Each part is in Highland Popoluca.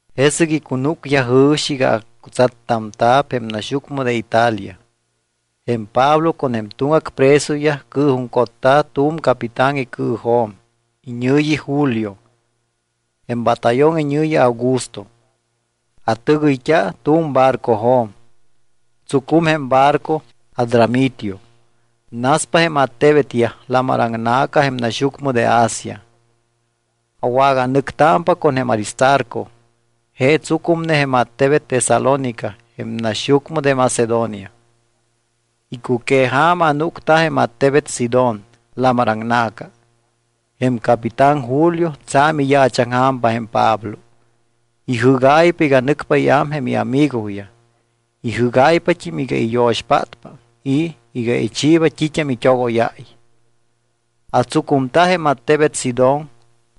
Jesɨc icunúcyaj jɨ̱xi iga acutsattamta̱p jém naxyucmɨ de Italia. Jém Pablo con jém tuŋgac presoyaj cɨɨjuŋcotta̱ tu̱m capitán icɨɨjo̱m. Iñɨ̱yi Julio. Jém batallón iñɨ̱yi Augusto. Atɨgɨyt́a tu̱m barcojo̱m. Tsucum jém barco Adramitio. Naspa jém attebetyaj lamar aŋna̱ca jém naxyucmɨ de Asia. Awaganɨctámpa con jém Aristarco. Je tsucumne jém attebet Tesalónica jém naxyucmɨ de Macedonia. Icuqueja̱ma anúcta jém attebet Sidón, lamar aŋna̱ca. Jém capitán Julio tsa̱m iyaachaŋja̱m jém Pablo. Ijɨ́gáypa iga nɨcpa iám jém iamigoyaj. Ijígáypat́im iga iyo̱xpátpa y iga ichiiba t́it́am it́ogóyáy. Atsucumta jém attebet Sidón.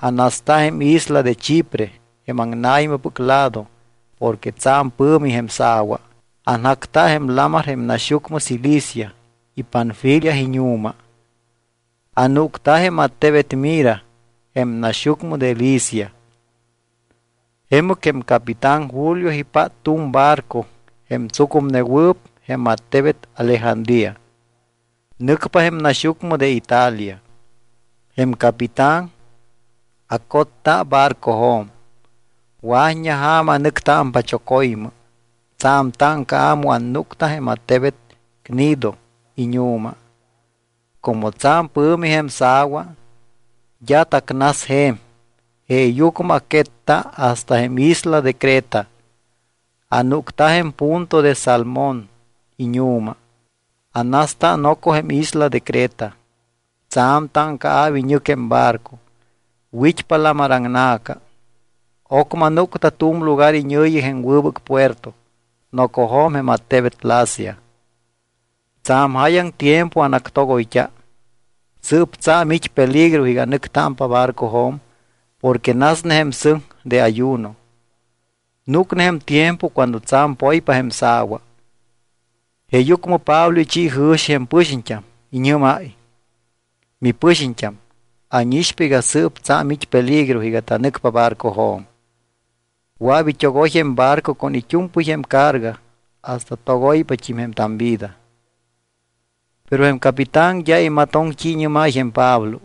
Anasta jém isla de Chipre jém aŋna̱ymɨpɨc lado porque tsa̱m pɨ̱mi jém sa̱wa. Anjacta jém lamar jém naxyucmɨ Cilicia y Panfilia iñu̱ma. Anúcta jém attebet Mira jém naxyucmɨ de Licia. Jemɨc jém capitán Julio ipát tu̱m barco jém tsucumnewɨɨp jém attebet Alejandría. Nɨcpa jém naxyucmɨ de Italia. Jém capitán acotta barcojo̱m. Wa̱t́ña ja̱ma anɨctámpa choco̱ymɨ. Tsa̱m táŋcaa̱ mu annúcta jém attebet Gnido iñu̱ma. Como tsa̱m pɨ̱mi jém sa̱wa, d́a tacnas je̱m. Jeeyucmɨ aquetta hasta jém isla de Creta. Anúcta jém punto de Salmón iñu̱ma. Anasta noco jém isla de Creta. Tsa̱m táŋcaa̱p iñɨc jém barco. Wit́pa lamaraŋna̱ca. Ocmɨ anúcta tu̱m lugar iñɨ̱yi jém Wɨbɨc Puerto, nocojo̱m jém attebet Lasea. Tsa̱m jáyaŋ tiempo anactogoyt́a. Sɨɨp tsa̱m it́ peligro iga anɨctámpa barcojo̱m porque nasne jém sɨŋ de ayuno. Núcne jém tiempo cuando tsa̱m poypa jém sa̱wa. Jeeyucmɨ Pablo ichi jɨ̱xi jém pɨxiñt́am. Iñɨ́máy: —Mipɨxiñt́am, ánixpa iga sɨɨp tsa̱m it́ peligro iga tanɨcpa barcojo̱m. Wɨa̱p it́ogoy jém barco con it́u̱mpɨy jém carga hasta togoypat́im jém tamvida. Pero jém capitán d́a imatoŋ t́i iñɨ́máy jém Pablo.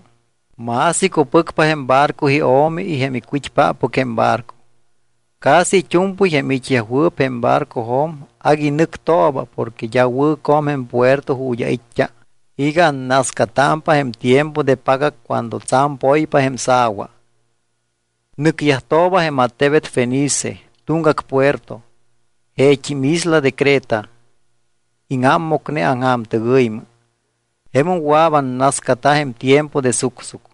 Más icupɨcpa jém barco io̱mi y jém icwit́páppɨc jém barco. Casi it́u̱mpɨy jém it́yajwɨɨp jém barcojo̱m agui nɨctooba porque d́a wɨ̱co̱m jém puerto ju̱t́ ait́t́a iga annascatámpa jém tiempo de pagac cuando tsa̱m poypa jém sa̱wa. Nɨcyajtooba jém attebet Fenice, tuŋgac puerto, jeet́im isla de Creta. Íŋámmocne aŋja̱mtɨgɨymɨ. Jemum wɨa̱p annascata jém tiempo de sucsuc.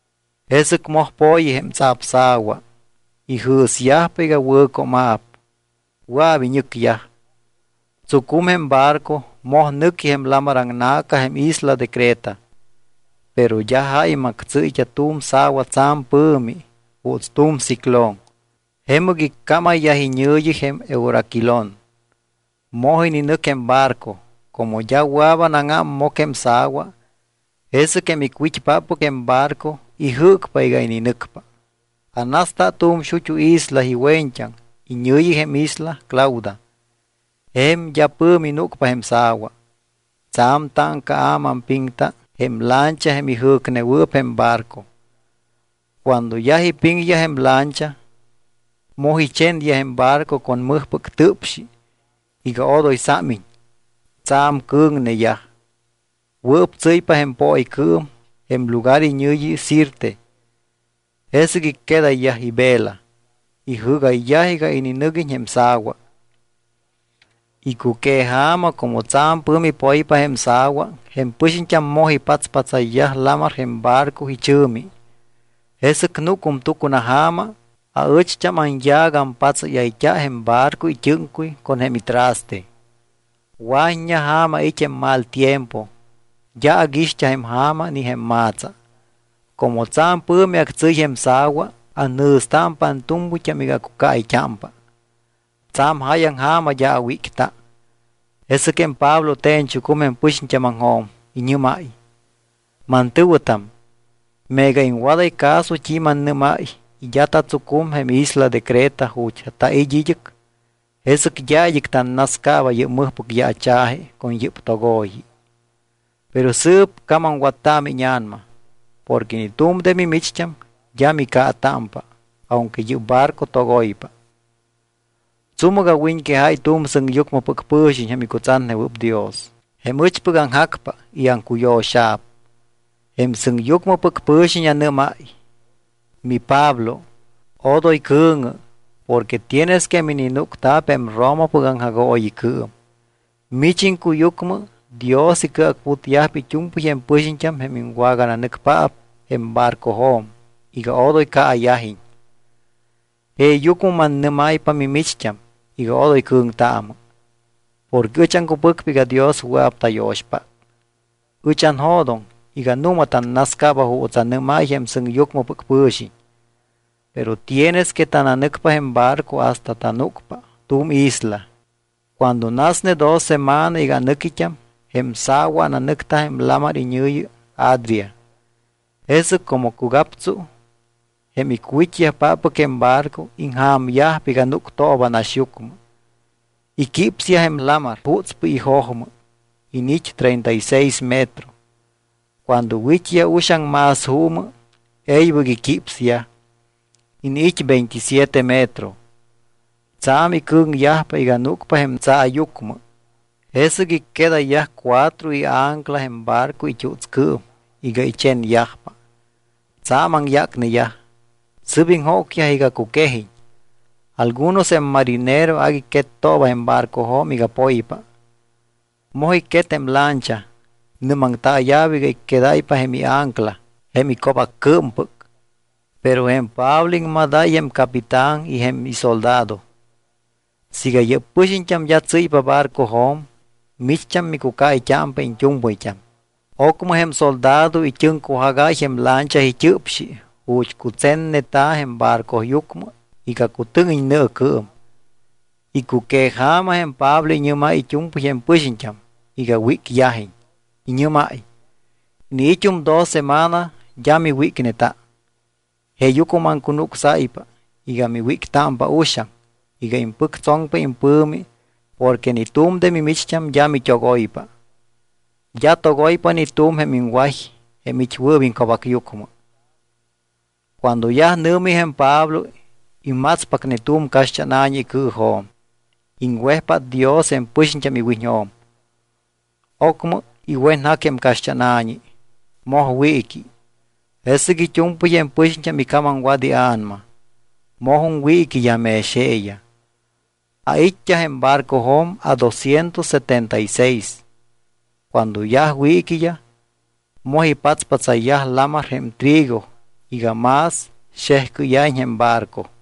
Jesɨc moj po̱yi jém tsapsa̱wa, ijɨ̱syajpa iga wɨ̱cooma̱p, wɨa̱p iñɨcyaj. Tsucum jém barco, moj nɨqui jém lamar aŋna̱ca jém isla de Creta. Pero d́a jáy mactsɨ́yt́a tu̱m sa̱wa tsa̱m pɨ̱mi. Juuts tu̱m ciclón. Jemɨc iccámayyaj iñɨ̱yi jém euraquilón. Moj ininɨc jém barco. Como d́a wɨa̱p anáŋámmoc jém sa̱wa, jesɨc jém icwit́páppɨc jém barco ijɨ́cpa iga ininɨcpa. Anasta tu̱m xut́u isla iwe̱ñt́aŋ, iñɨ̱yi jém isla Clauda. Je̱m d́a pɨ̱mi núcpa jém sa̱wa. Tsa̱m táŋcaa̱ maampiŋta jém lancha jém ijɨ̱cnewɨɨp jém barco. Cuando yaj ipiŋyaj jém lancha, moj ichenyaj jém barco con mɨjpɨc tɨpxi iga odoy sámiñ. Tsa̱m cɨ̱ŋneyaj. Wɨɨp tsɨ́ypa jém pooycɨɨm jém lugar iñɨ̱yi Sirte. Jesɨc icquedayyaj ivela. Ijɨ́gayyaj iga ininɨguiñ jém sa̱wa. Icuqueja̱ma como tsa̱m pɨ̱mi poypa jém sa̱wa, jém pɨxiñt́am moj ipatspatsayyaj lamar jém barco ichɨ̱mi. Jesɨc núcum tucunaja̱ma, aɨcht́am anyaac ampatsáyayt́a jém barco it́ɨ́ŋcuy con jém itraste. Wa̱t́ña ja̱ma it́ jém mal tiempo, d́a aguixt́a jém ja̱ma ni jém ma̱tsa. Como tsa̱m pɨ̱mi actsɨ́y jém sa̱wa, anjɨ̱stámpa antu̱mpɨyt́am iga acucaayt́ámpa. Tsa̱m jáyaŋ ja̱ma d́a awícta. Jesɨc jém Pablo te̱ñchucum jém pɨxiñt́ámaŋjo̱m. Iñɨ́máy: —Mantɨ̱wɨtam, meega iŋwadáy caso t́i mannɨ́máy y d́a tatsucum jém isla de Creta ju̱t́ tait́ id́ɨc, jesɨc d́a id́ɨc tannascaaba yɨ́p mɨjpɨc yaacha̱ji con yɨ́p togo̱yi. ’Pero sɨɨp camamwattaamɨ íña̱nama. Porque ni tu̱m de mimicht́am d́a micaatámpa aunque yɨ́p barco togoypa. Tsúmɨc awiñquejáy tu̱m sɨŋyucmɨpɨc pɨ̱xiñ jém icutsatnewɨɨp Dios, jém ɨchpɨc aŋjacpa y aŋcuyo̱xa̱p. Jém sɨŋyucmɨpɨc pɨ̱xiñ anɨ́máy: “MiPablo, odoy cɨ̱ŋɨ porque tienes que mininúcta̱p jém Romapɨc aŋjagooyicɨɨm. Mich iŋcuyucmɨ Dios icɨacputyajpa it́u̱mpɨy jém pɨxiñt́am jém iŋwagananɨcpaap jém barcojo̱m iga odoy caayajiñ.” Jeeyucmɨ mannɨ́máypa mimicht́am iga odoy cɨ̱ŋtaamɨ. Porque ɨch aŋcupɨcpa iga Dios wɨa̱p tayo̱xpát. Ɨch anjo̱doŋ iga nu̱ma tannascaaba juuts anɨ́máy jém sɨŋyucmɨpɨc pɨ̱xiñ. Pero tienes que tananɨcpa jém barco hasta tananúcpa tu̱m isla. Cuando nasne dos semana iga anɨquit́am, jém sa̱wa ananɨcta jém lamar iñɨ̱yi Adria. Jesɨc como cugaptsu jém icwit́yajpáppɨc jém barco ija̱myajpa iga núctooba naxyucmɨ. Iquípsyaj jém lamar jutspɨy ijojmɨ. Iniit́ treinta y seis metro. Cuando wit́yaj uxaŋ más juumɨ, e̱ybɨc iquípsyaj, iniit́ veintisiete metro. Tsa̱m icɨ̱ŋyajpa iga núcpa jém tsaayucmɨ, jesɨc icquedayyaj cuatro iancla jém barco it́utscɨɨm iga ichenyajpa. Tsa̱m aŋyácneyaj, sɨ́p iŋjócyaj iga cuquejiñ. Algunos jém marinero agui quettooba jém barcojo̱m iga poypa. Moj icquet jém lancha, nɨ́maŋtaaya̱p iga icquedáypa jém iancla jém ico̱baccɨɨmpɨc. Pero jém Pablo iŋmadáy jém capitán y jém isoldado: —Siiga yɨ́p pɨxiñt́am d́a tsɨ́ypa barcojo̱m, micht́am micucaayt́ámpa iñt́u̱mpɨyt́am. Ocmɨ jém soldado it́ɨŋcujagáy jém lancha it́ɨpxi ju̱t́ cutsenneta̱ jém barcoyucmɨ iga cutɨ́ŋiñ nɨɨcɨɨm. Icuqueja̱ma jém Pablo iñɨ́máy it́u̱mpɨy jém pɨxiñt́am iga wícyajiñ. Iñɨ́máy: —Iniit́um dos semana d́a miwícneta. Jeeyucmɨ maŋcunucsáypa iga miwíctámpa uxaŋ iga impɨctsoŋpa impɨ̱mi porque ni tu̱m de mimicht́am d́a mit́ogoypa, d́a togoypa ni tu̱m jém iŋway jém it́wɨɨp iŋco̱bacyucmɨ. Cuando yaj nɨ̱mi jém Pablo, imatspacne tu̱m caxt́ána̱ñi icɨɨjo̱m. Iŋwejpát Dios jém pɨxiñt́am iwiñjo̱m. Ocmɨ iwenjac jém caxt́ána̱ñi, moj wiiqui. Jesɨc it́u̱mpɨy jém pɨxiñt́am icamamwat ia̱nama. Mojum wiiquiyaj mex jeeyaj. Ait́t́a jém barcojo̱m adosciento setenta y seis. Cuando yaj wiiquiyaj, moj ipatspatsayyaj lamar jém trigo iga más xejcɨ́ya̱iñ jém barco.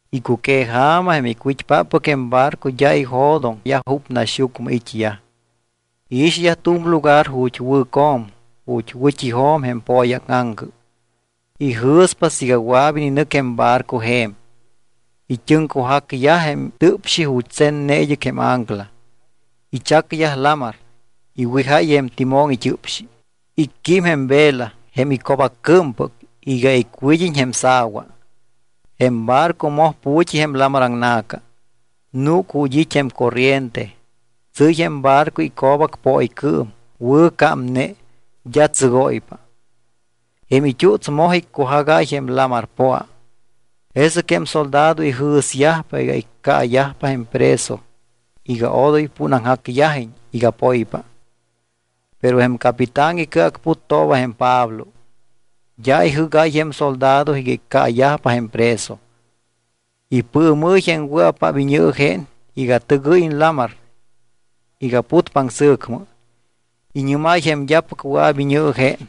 Icuqueja̱ma jém icwit́páppɨc jém barco d́a ijo̱doŋyaj júp naxyucmɨ it́yaj. Iixyaj tu̱m lugar ju̱t́ wɨ̱co̱m ju̱t́ wɨ̱t́ijo̱m jém pooyáŋaŋcɨ. Ijɨ̱spa siiga wɨa̱p ininɨc jém barco je̱m. It́ɨŋcujacyaj jém tɨpxi ju̱t́ tsenne id́ɨc jém ancla, ichacyaj lamar. Iwijáy jém timón it́ɨpxi. Icquím jém vela, jém ico̱baccɨɨmpɨc, iga icwíd́iñ jém sa̱wa. Jém barco moj pu̱t́i jém lamar aŋna̱ca. Núc ju̱t́ it́ jém corriente, tsɨ́y jém barco ico̱bac pooycɨɨm, wɨ̱ cámne, d́a tsɨgóypa. Jém it́uts moj iccujagáy jém lamar poa. Jesɨc jém soldado ijɨ̱syajpa iga iccaayajpa jém preso iga odoy púnaŋjacyajiñ iga poypa. Pero jém capitán icɨacputtooba jém Pablo. D́a ijɨ́gáy jém soldado iga iccaayajpa jém preso. Ipɨɨmɨ́y jém wɨa̱paap iñɨɨjén iga tɨgɨ́yiñ lamar iga putpa aŋsɨ̱cmɨ. Iñɨ́máy jém d́apɨc wɨa̱p iñɨɨjén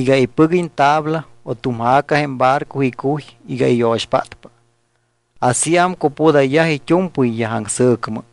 iga ipɨguiñ tabla o tu̱m ja̱ca jém barco icuy iga iyo̱xpátpa. Asíam cupudayyaj it́u̱mpɨyyaj aŋsɨ̱cmɨ.